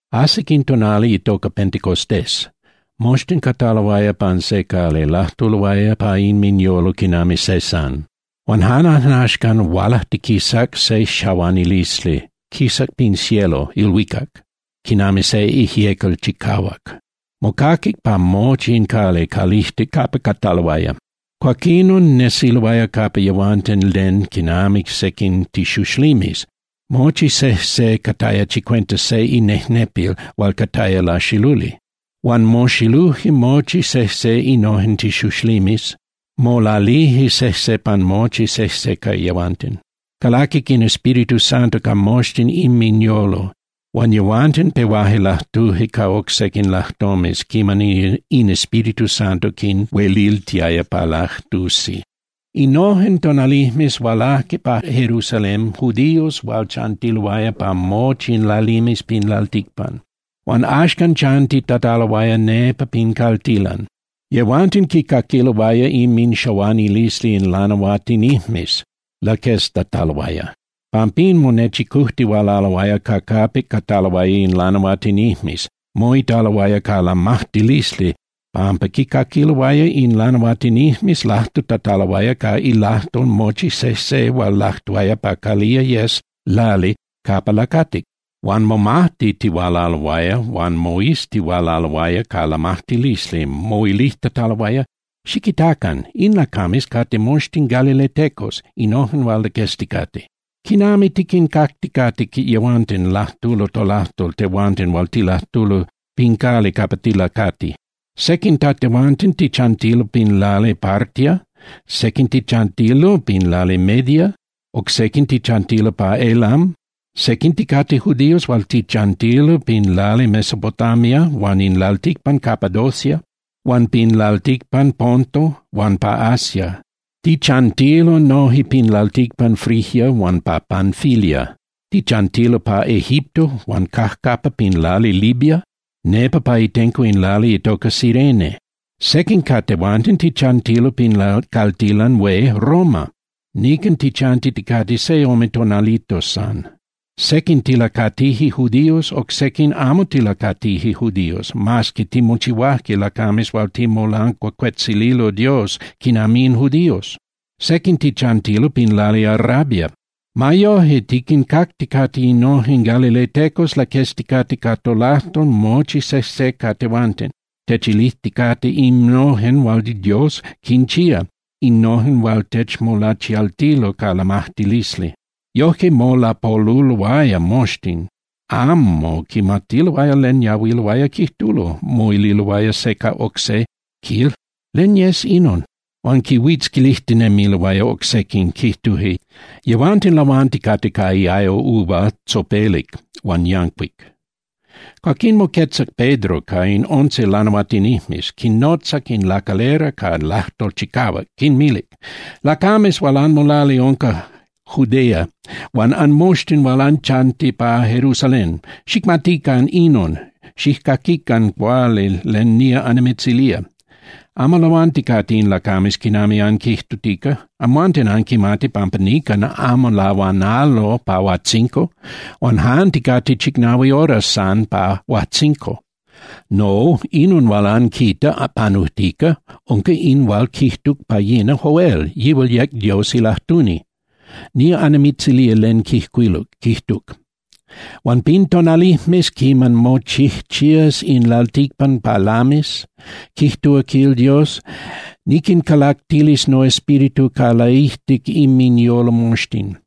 Ajsic in tonali itoca Pentecostés, moxtin cataloaya pan se cali, lajtuloaya pa inminyolo quinami se san. Huan jan ajnaxcan hualajtiquisac se xahuanilisli, quisac pin cielo (ilhuicac) quinami se ijyecal chicahuac. Mocaquic pa mochi in cali calijtic capa cataloaya. Cuaquinon nesiloaya capa yehuanten len quinami sequin tixuxlimes. Mochi sejse cataya chicuenta se inejnepil hual cataya laxiluli. Huan moxiluje mochi sejse innojen tixuxlimes, molalije sejse pan mochi sejse ca yehuanten. Calaquic in Espíritu Santo ca moxtin inminyolo, huan yehuanten pehuaje lajtuje ca oc sequin lajtomes quiman in Espíritu Santo quinhueliltiaya pa lajtusi. Innojen tonalijmes hualajque pa Jerusalén judíos hual chantiloaya pa mochi in lalimes pin lalticpan, hual axcan chantitataloaya nepa pin caltilan. Yehuanten quicaquiloaya inminxahuanilisli in lanahuatinijmes laqueztataloaya. Pampín monechicujtihualaloaya ca capic cataloaya in lanahuatinijmes, moitaloaya ca lamajtilisli pampa quicaquiloaya in lanahuatinijmes lajtutataloaya ca ilajtol mochi sejse hual lajtuaya pa calía yes lali capa lacatic. Huan momajtitihualaloaya huan moiztihualaloaya ca lamajtilisli moilijtataloaya: —Xiquitacan. In lacames cate moxtin galiletecos, innojen hual laquezticate. ¿Quinami tiquincacticate yehuanten lajtulo tolajtol tehuanten hual tilajtulo pin lali capa tilacatije? Sequin ca tehuanten tichantilo pin lali Partia, sequin tichantilo pin lali Media, oc sequin tichantilo pa Elam. Sequin ticate judíos hual tichantilo pin lali Mesopotamia huan in lalticpan Capadocia, huan pin lalticpan Ponto huan pa Asia. Tichantilo noje pin lalticpan Frigia huan pa Panfilia. Tichantilo pa Egipto huan cajcapa pin lali Libia nepa pa itenco in lali itoca Cirene. Sequin ca tehuanten tichantilo pin caltilan hué Roma, nican tichantiticate se ome tonalitos san. Sequin tilacatije judíos, oc sequin amo tilacatije judíos, mas que timochihuaje lacames hual ticmolancuacuetzililo Dios quinami in judíos. Sequin tichantilo pin lali Arabia. Ma yoje tiquincacticate innojen galiletecos laquezticate ca tolajtol mochi sejse ca tehuanten, techilijticate innojen hual Dios quinchía, innojen hual techmolachialtilo ca lamajtilisli. Yojque molapoluloaya moxtin, amo quimatiloaya len yahuiloaya quijtulo, moililoaya se ca oc se, quil: —¿Len yes inon? Huan quinhuitzquilijtinemiloaya oc sequin, quijtuje: —Yehuanten lahuanticate ca iayo uva tzopelic huan yancuic. Cuaquinon moquetzac Pedro ca in once lanahuatinijmes, quinnotzac in lacalera ca lajtol chicahuac, quinmilic: —Lacames hual anmolali unca Judea huan anmoxtin hual anchanti pa Jerusalén, xicmatican inon, xijcaquican cuali len nía annimitzilía. Amo lahuanticate in lacames quinami anquijtutica. Amhuanten anquimati pampa nican amo lahuanalo pa huajtzinco, huan jan ticate chicnahui horas san pa huajtzinco. No, inon hual anquita panujtica unca in hual quijtuc pa yina Joel, yihual yec Dios ilajtuni. Nía annimitzilía len quijcuiluc. Quijtuc: Huan pin tonalijmes quiman mochijchías in lalticpan pa lamis, quijtúa quil Dios, niquincalactilis noEspíritu ca laijtic inminyolo moxtin.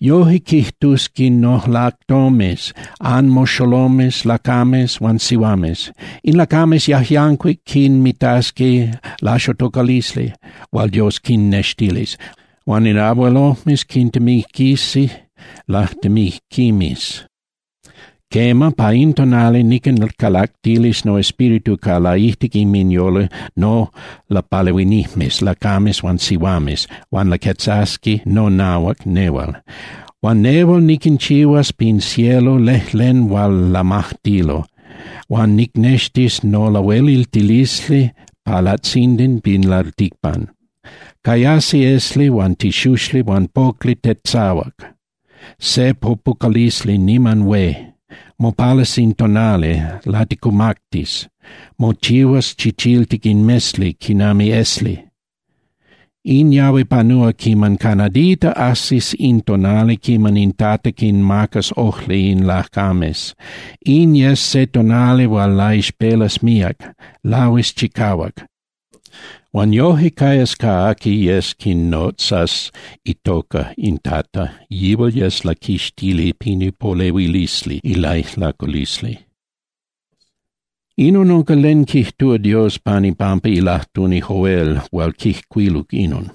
Yoje quijtusqui nolajtomes anmoxolomes lacames huan sihuames. In lacames yajyancuic quinmitasqui laixotocalisli hual Dios quinnextilis, huan in abuelojmes quintemiquisi lajtemijquimes. Quema, pa in tonali niquincalactilis noEspíritu ca laijtic inminyolo nolapalehuinijmes lacames huan sihuames, huan laquetzasqui nonahuac nehual. Huan nehual niquinchihuas pin cielo lejlen hual lamajtilo, huan nicnextis nolahueliltilisli pa latzindan pin lalticpan. Cayasi esli huan tixuxli huan pocli tetzahuac, se popucalisli niman hué. Mopalas in tonali, laticumactis, mochihuas chichiltic in mesli quinami esli. In yahui panúa quiman ca nadita ajsis in tonali quiman in Tata quinmacas ojli in lacames, In yes se tonali hual laixpelas míac, lahuis chicahuac. Huan yoje cayas ca aqui yes quinotzas itoca in Tata, yihual yes laquixtili pin ipolehuilisli ilaijlaculisli. Inon unca len quijtúa Dios pan ipampa ilajtuni Joel hual quijcuiluc inon.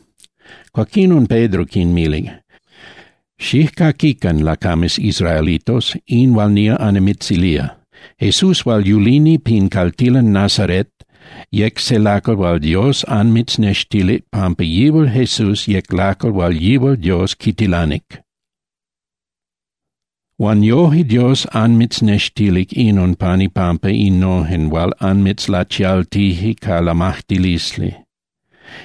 Cuaquinon Pedro quinmilic: —Xijcaquican, lacames israelitos, in hual nía annimitzilía. Jesús hual yulini pin caltilan Nazaret yec se lacal hual Dios anmitznextilic pampa yihual Jesús yec lacal hual yihual Dios quitilanic. Huan yoje Dios anmitznextilic inon pan ipampa innojen hual anmitzlachialtije ca lamajtilisli.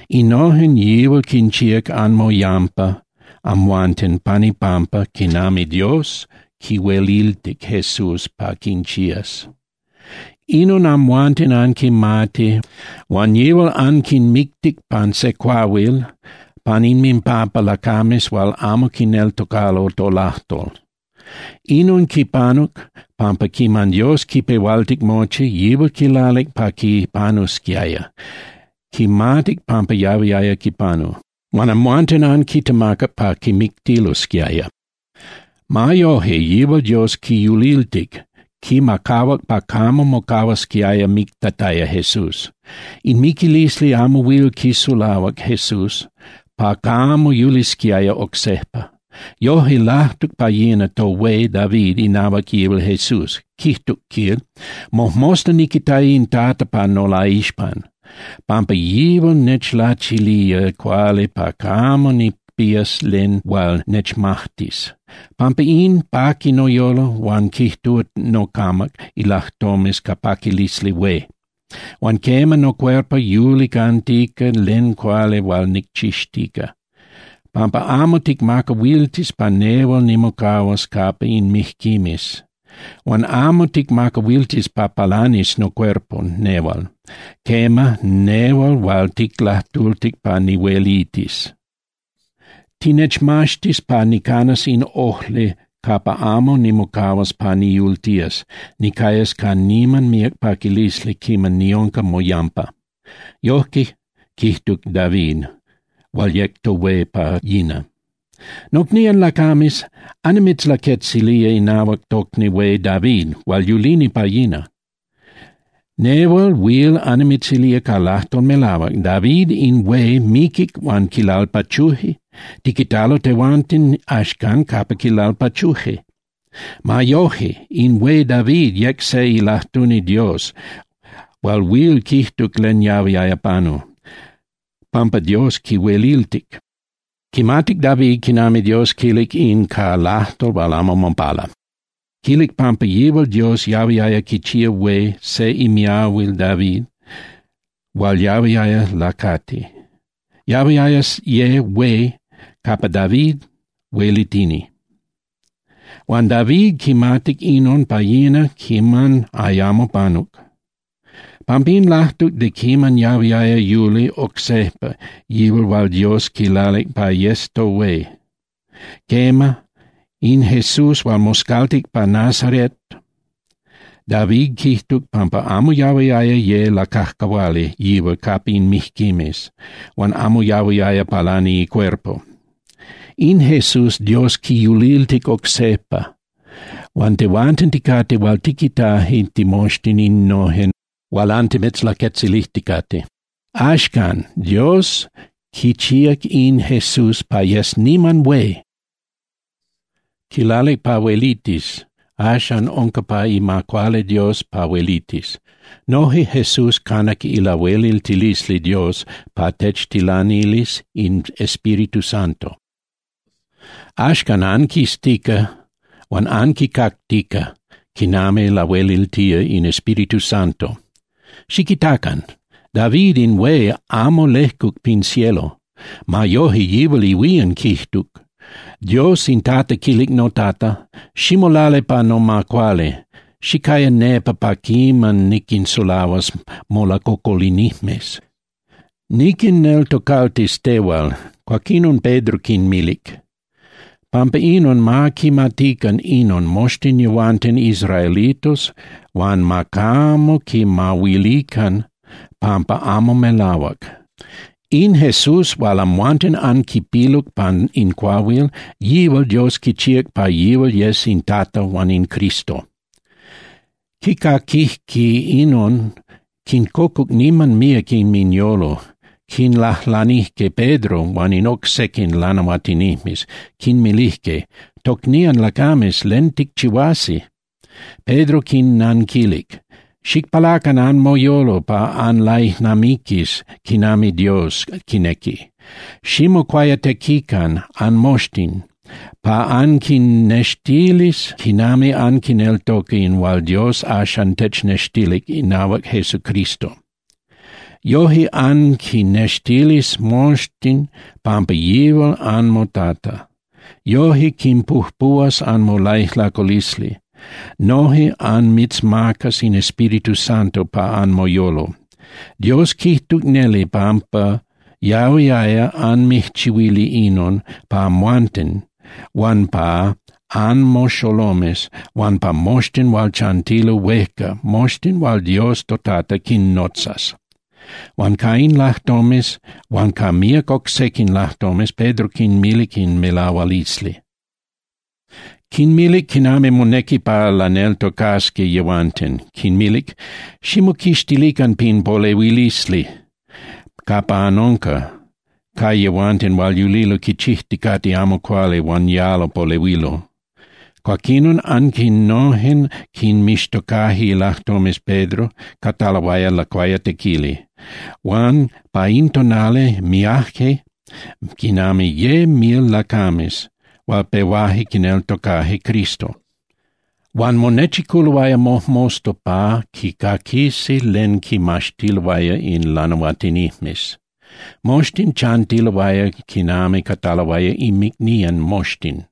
Innojen yihual quinchíac anmoyampa amhuanten pan ipampa quinami Dios quihueliltic Jesús pa quinchías. Inon amhuanten anquimati. Huan yihual anquimictic pan se cuahuil pan inminpampa lacames hual amo quineltocalo tolajtol. Inon quipanuc, pampa quiman Dios quipehualtic mochi, yihual quilalic pa quipanusquiaya, quimatic pampa yahuiaya quipanu. Huan amhuanten anquitemacac pa quimictilosquiaya. Ma yoje, yihual Dios quiyuliltic, quimacahuac pa camo mocahuasquiaya mictataya Jesús. In miquilisli amo huil quisulahuac Jesús pa camo yulisquiaya oc sejpa. Yoje lajtuc pa yina tohué David inahuac yihual Jesús, quijtuc, quil: Mojmosta niquitaya in Tata pa nolaixpan, pampa yihual nechlachilía cuali pa camo nicpías len hual nechmajtis. Pampa in, paqui noyolo huan quijtúa nocamac ilajtomes ca paquilisli hué, huan quema, nocuerpo yuli cantica len cuali hual nicchixtica. Pampa amo ticmacahuiltis pa nehual nimocahuas capa in mijquimes. Huan amo ticmacahuiltis pa palanis nocuerpo nehual, quema, nehual hual ticlajtultic pa nihuelitis. Tinechmaxtis pa nicanas in ojli capa amo nimocahuas pa niyultías, nicayas ca niman míac paquilisli quiman niunca moyampa. Yojque quijtuc David hual yec tohué pa yina. ’Nocnían lacames, annimitzlaquetzilía inahuac tocni hué David hual yulini pa yina. Nehual huil annimitzilía ca lajtol melahuac, David in hué miquic huan quilalpachuje, tiquitalo tehuanten axcan capa quilalpachuje. Ma yoje, in hué David yec se ilajtuni Dios hual huil quijtuc len yahuiaya panu, pampa Dios quihueliltic. Quimatic David quinami Dios quilic in ca lajtol hual amo mopala. Quilic pampa yihual Dios yahuiaya quichía hué se imiahuil David hual yahuiaya lacati. Yahuiaya ye hué capa David huelitini. Huan David quimatic inon pa yina quiman ayamo panuc. Pampín lajtuc de quiman yahuiaya yuli oc sejpa yihual hual Dios quilalic pa yes tohué, quema, in Jesús hual moscaltic pa Nazaret. David quijtuc pampa amo yahuiaya ye lacajcahuali yihual capa in mijquimes, huan amo yahuiaya palani icuerpo. In Jesús Dios quiyuliltic oc sejpa, huan tehuanten ticate hual tiquitaje timoxtin innojen hual antimitzlaquetzilijticate. Axcan, Dios quichíac in Jesús pa yes niman hué. Quilalic pa huelitis, axan unca pa ima cuali Dios pa huelitis. Noje Jesús canac ilahueliltilisli Dios pa techtilanilis in Espíritu Santo. Axcan anquiztica huan anquicactica quinami lahueliltía in Espíritu Santo. Xiquitacan. David in hué amo lejcuc pin cielo. Ma yoje yihual ihuían quijtuc: Dios in Tata quilic noTata: “Ximolali pa noma cuali, xicaya nepa pa quiman niquinsulahuas molacocolinijmes. Niquinneltocaltis tehual.” Cuaquinon Pedro quinmilic: —Pampa inon ma quimatican inon moxtin yehuanten israelitos huan ma camo quimahuilican pampa amo melahuac: In Jesús hual amhuanten anquipiluc pan in cuahuil, yihual Dios quichía pa yihual yes in Tata huan in Cristo. Quicaquijque inon, quincocuc niman míac inminyolo, quinlajlanijque Pedro huan in oc sequin lanahuatinijmes, quinmilijque: —Tocnían lacames, ¿len ticchihuasi? Pedro quinnanquilic: —Xicpalacan anmoyolo pa anlaijnamiquis quinami Dios quinequi, ximocuayatequican anmoxtin pa anquinextilis quinami anquineltoca in hual Dios axan technextilic inahuac Jesucristo. Yoje anquinextilis moxtin pampa yihual anmoTata. Yoje quinpujpuhuas anmolaijlaculisli, noje anmitzmacas in Espíritu Santo pa anmoyolo. Dios quijtuc neli pampa yahuiaya anmijchihuili inon pa amhuanten huan pa anmoxolomes huan pa moxtin hual chantilo huejca, moxtin hual Dios toTata quinnotzas. Huan ca in lajtomes huan ca míac oc sequin lajtomes, Pedro quinmilic in melahualisli. Quinmilic quinami monequi pa laneltocasqui yehuanten, quinmilic: —Ximoquixtilican pin polehuilisli capa anunca ca yehuanten hual yulilo quichijticate amo cuali huan yalo polehuilo. Cuaquinon, aquinojen quinmixtocaje ilajtomes Pedro cataloaya lacuayatequili. Huan pa in tonali miaje quinami ye mil lacames hual pehuaje quineltocaje Cristo. Huan monechiculoaya mojmosta pa quicaquisi len quimaxtiloaya in lanahuatinijmes. Moxtin chantiloaya quinami cataloaya inmicnían moxtin,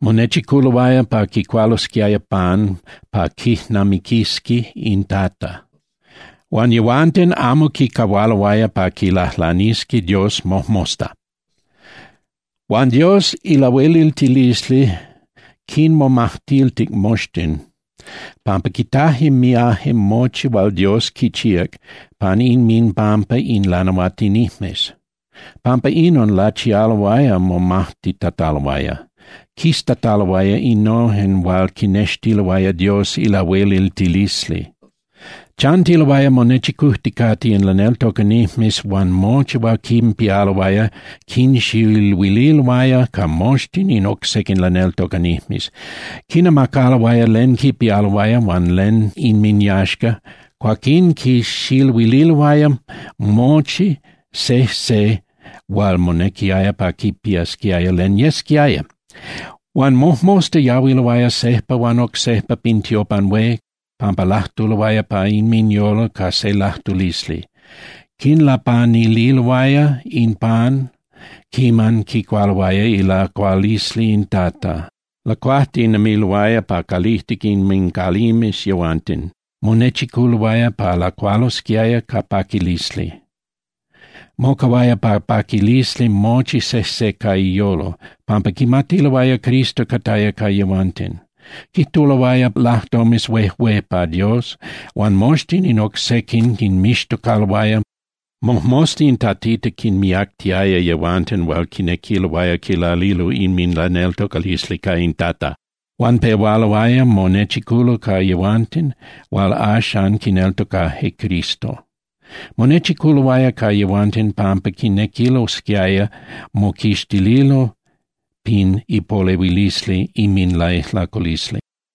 monechiculoaya pa quicualosquiaya pan pa quijnamiquisqui in Tata. Huan yehuanten amo quicahualoaya pa quilajlanisqui Dios mojmosta. Huan Dios ilahueliltilisli quinmomajtiltic moxtin pampa quitaje miaje mochi hual Dios quichíac pan inminpampa in lanahuatinijmes. Pampa inon lachialoaya momajtitataloaya, quiztataloaya innojen hual quinextiloaya Dios ilahueliltilisli. Chantiloaya monechicujticate in laneltocanijmes huan mochi hual quinpialoaya quinxiluililoaya ca moxtin in oc sequin laneltocanijmes. Quinamacaloaya len quipialoaya huan len inminyaxca, cuaquín quixiluililoaya mochi sejse hual monequiaya pa quipiasquiaya len yesquiaya. Huan mojmosta yahuiloaya sejpa huan oc sejpa pin tiopan hué pampa lajtuloaya pa inminyolo ca se lajtulisli. Quinlapanililoaya in pan quiman quicualoaya ilacualisli in Tata. Lacuajtinemiloaya pa calijtic inmincalimes yehuanten, monechiculoaya pa lacualosquiaya ca paquilisli. Mocahuaya ca paquilisli mochi sejse ca iyolo, pampa quimatiloaya Cristo cataya ca yehuanten. Quijtuloaya lajtomes huejué pa Dios, huan moxtin in oc sequin quinmixtocaloaya. Mojmosta in Tatita quinmiactiaya yehuanten hual quinequiloaya quilalilo inminlaneltocalisli ca in Tata. Huan pehualoaya monechiculo ca yehuanten hual axan quineltocajque Cristo. Monechiculoaya ca yehuanten pampa quinequilosquiaya moquixtililo pin ipolehuilisli inminlaijlaculisli.